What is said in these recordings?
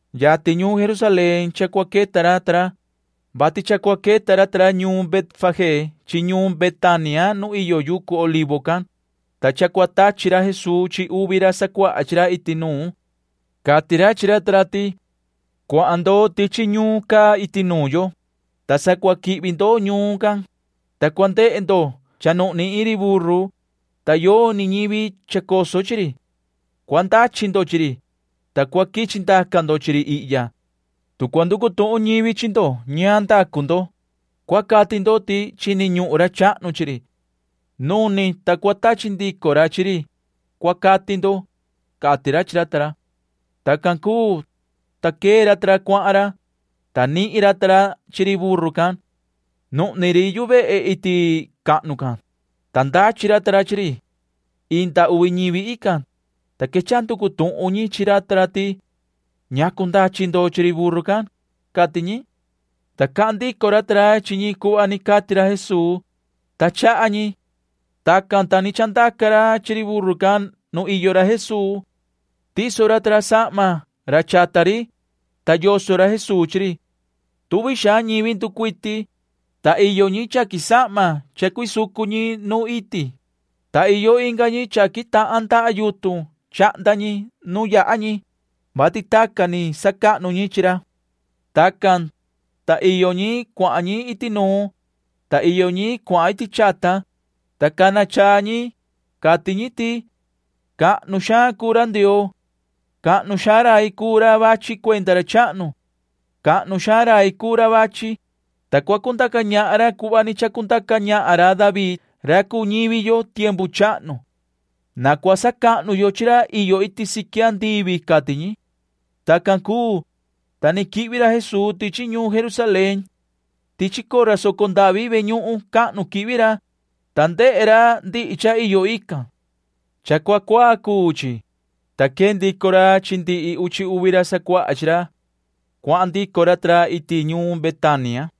Yatin ñuun Jerusalén cha cua queta ra ta ra, vati cha cua queta ra ta ra ñuun Betfagé chi ñuun Betania nu iyo yucu Olivo can, ta cha cua tachi ra Jesuu chi uvi ra sacuaha chi ra iti nuun. Cati ra chi ra ta ra ti: ―Cuahan ndo tichi ñuun caa iti nuun yo, ta sa cua quihvi ndo ñuun can, ta cua ndehe ndo cha nuhni iin ri buru, ta yoni ñivi chacoso chi ri. Cua ndachi ndo chi ri, ta cua quichi ndaca ndo chi ri ihya. Tu cua nducu tuhun ñivi chi ndo ñaan ndacu ndo, cua cati ndo ti chini ñuhun ra chahnu chi ri. Nuni, ta cua tachi ndico ra chi ri, cua cati ndo ―cati ra chi ra ta ra. Tacan cuu, ta quee ra ta ra cuahan ra, ta nihin ra ta ra chi ri buru can. Nuhni ri yu vehe iti cahnu can, ta ndachi ra ta ra chi ri. Inda uvi ñivi ican, ta quechaha nducu tuhun ñi chi ra ta ra ti: ―¿Ñacu ndachi ndo chi ri buru can? ―cati ñi. Ta cahan ndico ra ta ra chi ñi cuhva ni cati ra Jesuu, ta chaha ñi. Tacan, ta ni chandaca ra chi ri buru can nu iyo ra Jesuu. Tiso ra ta ra sahma ra chata ri, ta yoso ra Jesuu chi ri. Tuvi xaan ñivi nducuiti, ta iyo ñi chaqui sahma cha cuisucu ñi nuun iti, ta iyo inga ñi chaqui tahan ndaha yutun chahnda ñi nu yaha ñi, [vati tacan ni sacahnu ñi chi ra]. Tacan, ta iyo ñi cuahan iti nuun, ta iyo ñi cuahan iti chata, ta cana chaa ñi. Cati ñi ti: ―¡Cahnu xaan cuu ra Ndioo! ¡Cahnu xaan rai cuu ra vachi cuenda ra chahnu! ¡Cahnu xaan rai cuu ra vachi, ta cua cundaca ñahan ra cuhva ni chacundaca ñahan ra David [ra cuu ñivi yo] tiempu chahnu! ¡Na cua sacahnu yo chi ra iyo iti siqui andivi! ―cati ñi. Tacan cuu, ta ni quihvi ra Jesuu tichi ñuun Jerusalén. Tichi cora soco ndavi ve ñuhun cahnu quihvi ra, ta ndehe ra ndihi cha iyo ican. Cha cua cuaa cuu chi, ta quee ndico ra chi ndihi uchi uvi ra sacuaha chi ra. Cuahan ndico ra ta ra iti ñuun Betania.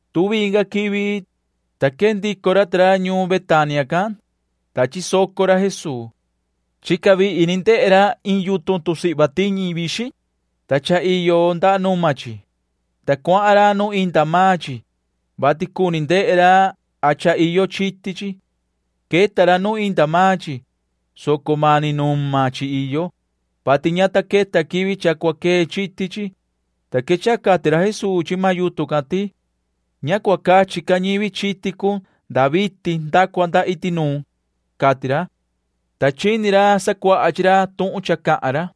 Tuvi inga quivi, ta quee ndico ra ta ra ñuun Betania can, ta chisoco ra Jesuu. Chica vihi ni ndehe ra iin yutun tusihva tiñi vixin, ta cha iyo nda numa chi, ta cuahan ra nu inda maan chi, vati cuni ndehe ra a cha iyo chiti chi. Queta ra nu inda maan chi, soco mani numa chi iyo, vati ña ta queta quivi cha cua quee chiti chi, ta quechaha cati ra Jesuu chi maan yutun can ti: ―Ña cua cachi ca ñivi chiti cun nda vitin nda cua nda iti nuun ―cati ra. Ta chini ra sacuaha chi ra tuhun cha cahan ra.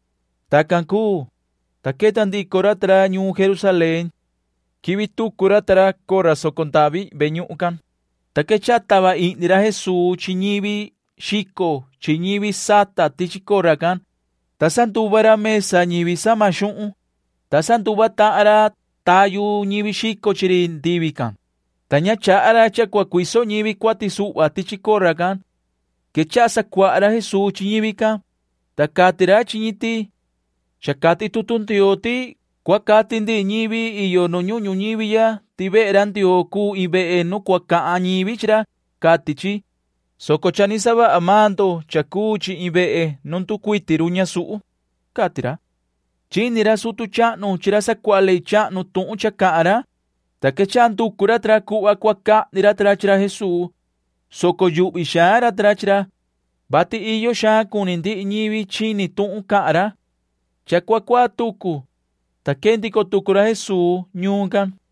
Tacan cuu, ta queta ndico ra ta ra ñuun Jerusalén. Quihvi tucu ra ta ra cora soco ndavi ve ñuhun can, ta quechaha tava ihni ra Jesuu chi ñivi xico chi ñivi sata tichi cora can, ta sanduva ra mesa ñivi sama xuhun, ta sanduva tahan ra tayu ñivi xico chi ri ndivi can, ta ña chaha ra cha cua cuiso ñivi cuati suhva tichi cora can. Quechaha sacuaha ra Jesuu chi ñivi can, ta cati ra chi ñi ti: ―Cha cati tutu Ndioo ti cua cati ndihi ñivi iyo nu ñuhun ñuñivi ya ti vehe ra Ndioo cuu iin vehe nu cua cahan ñivi chi ra, cati chi, soco cha ni savaha maan ndo cha cuu chi iin vehe nu nducuiti run ñasuhu ―cati ra. Chini ra sutu chahnu chi ra sacuaha ley chahnu tuhun cha cahan ra, ta quechaha nducu ra ta ra cuhva cua cahni ra ta ra chi ra Jesuu, soco yuhvi xaan ra ta ra chi ra, vati iyo xaan cuni ndihi ñivi chini tuhun cahan ra. Cha cua cuaa tucu, ta quee ndico tucu ra Jesuu ñuun can.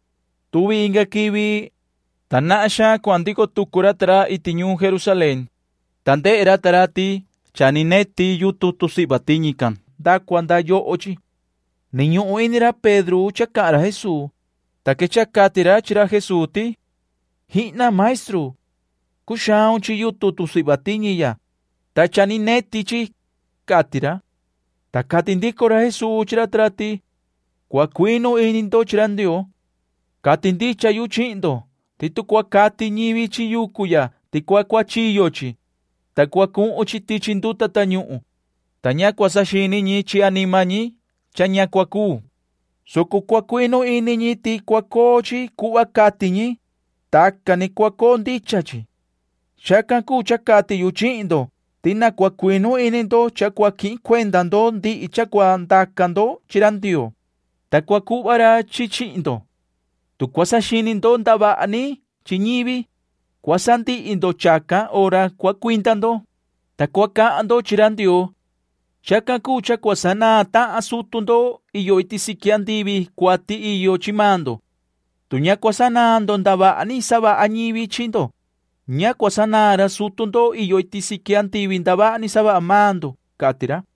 Tuvi inga quivi, ta nahan xaan cuahan ndico tucu ra ta ra iti ñuun Jerusalén, ta ndehe ra ta ra ti cha ni neti yutun tusihva tiñi can nda cua nda yoho chi. Ni ñuhun ini ra Pedro cha cahan ra Jesuu, ta quechaha cati ra chi ra Jesuu ti: ―¡Jihna! maestru. Cuxaun chi yutun tusihva tiñi ya, ta cha ni neti chi ―cati ra. Ta cati ndico ra Jesuu chi ra ta ra ti: ―Cua cuinu ini ndo chi ra Ndioo. Cati ndicha yu chihin ndo ti tu cua cati ñivi chi yucu ya ti cua cuachiyo chi, ta cua cuhun chi tichi nduta tañuhun, ta ña cua saxini ñi chi anima ñi cha ña cua cuu, soco cua cuinu ini ñi ti cua coo chi cuhva cati ñi, tacan ni cua coo ndicha chi. Chacan cuu cha cati yu chihin ndo ti na cua cuinu ini ndo cha cua quihin cuenda ndo ndihi cha cua ndaca ndo chi ra Ndioo, ta cua cuhva ra chi chi chihin ndo. Tu cua saxini ndo ndavaha ni chi ñivi, cua sandihi ndo chacan hora cua cuinda ndo, ta cua cahan ndo chi ra Ndioo. Chacan cuu cha cua sanaan tahan sutu ndo iyo iti siqui andivi cuati iyo chi maan ndo. Tu ña cua sanaan ndo ndavaha ni savaha ñivi chi ndo, ña cua sanaan ra sutu ndo iyo iti siqui ndavaha ni savaha maan ndo ―cati ra.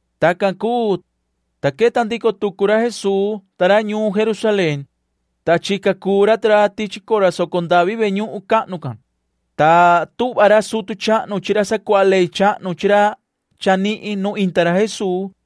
Tacan cuu, ta queta ndico tucu ra Jesuu ta ra ñuun Jerusalén, ta chica cuu ra ta ra tichi cora soco ndavi ve ñuhun cahnu can, ta tuhva ra sutu chahnu chi ra sacuaha ley chahnu chi ra chanihin nu inda ra Jesuu,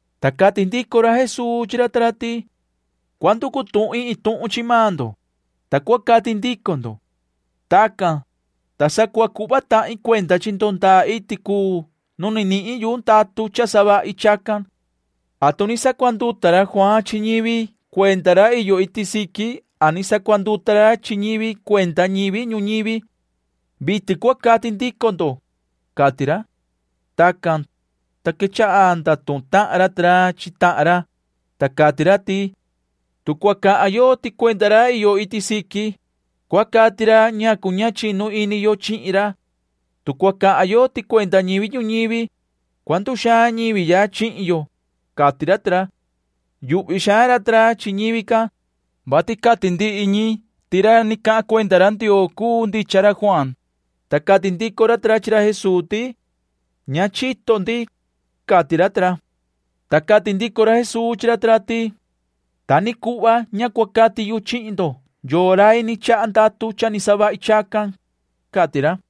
Ta cati ndico ra Jesuu chi ra ta ra ti: ―Cua nducu tuhin iin tuhun chi maan ndo, ta cua cati ndico ndo. Tacan, ta sa cua cuhva tahin cuenda chi ndo ndaa iti cuu nu ni nihin yu ndatu cha savahi chacan. ¿Atu ni sacuanduta ra Juaan chi ñivi cuenda ra iyo iti siqui a ni sacuanduta ra chi ñi cuenda ñivi ñuñivi? Vitin cua cati ndico ndo ―cati ra. Tacan, ta quechaha ndatuhun tahan ra ta ra chi tahan ra, ta cati ra ti: ―Tu cua cahan yo ti cuenda ra iyo iti siqui, cua cati ra ñacu ña chinu ini yo chihin ra. Tu cua cahan yo ti cuenda ñivi ñuñivi, cua nduxaan ñivi ya chihin yo ―cati ra ta ra. Yuhvi xaan ra ta ra chi ñivi can, vati cati ndihi ñi ti ra ni cahan cuenda ra Ndioo cuu ndicha ra Juaan, ta cati ndico ra ta ra chi ra Jesuu ti: ―Ña chito ndi ―cati ra ta ra. Ta cati ndico ra Jesuu chi ra ta ra ti: ―Ta ni cuhva ña cua cati yu chihin ndo yoo rai ni chaha ndatu cha savahi chacan ―cati ra.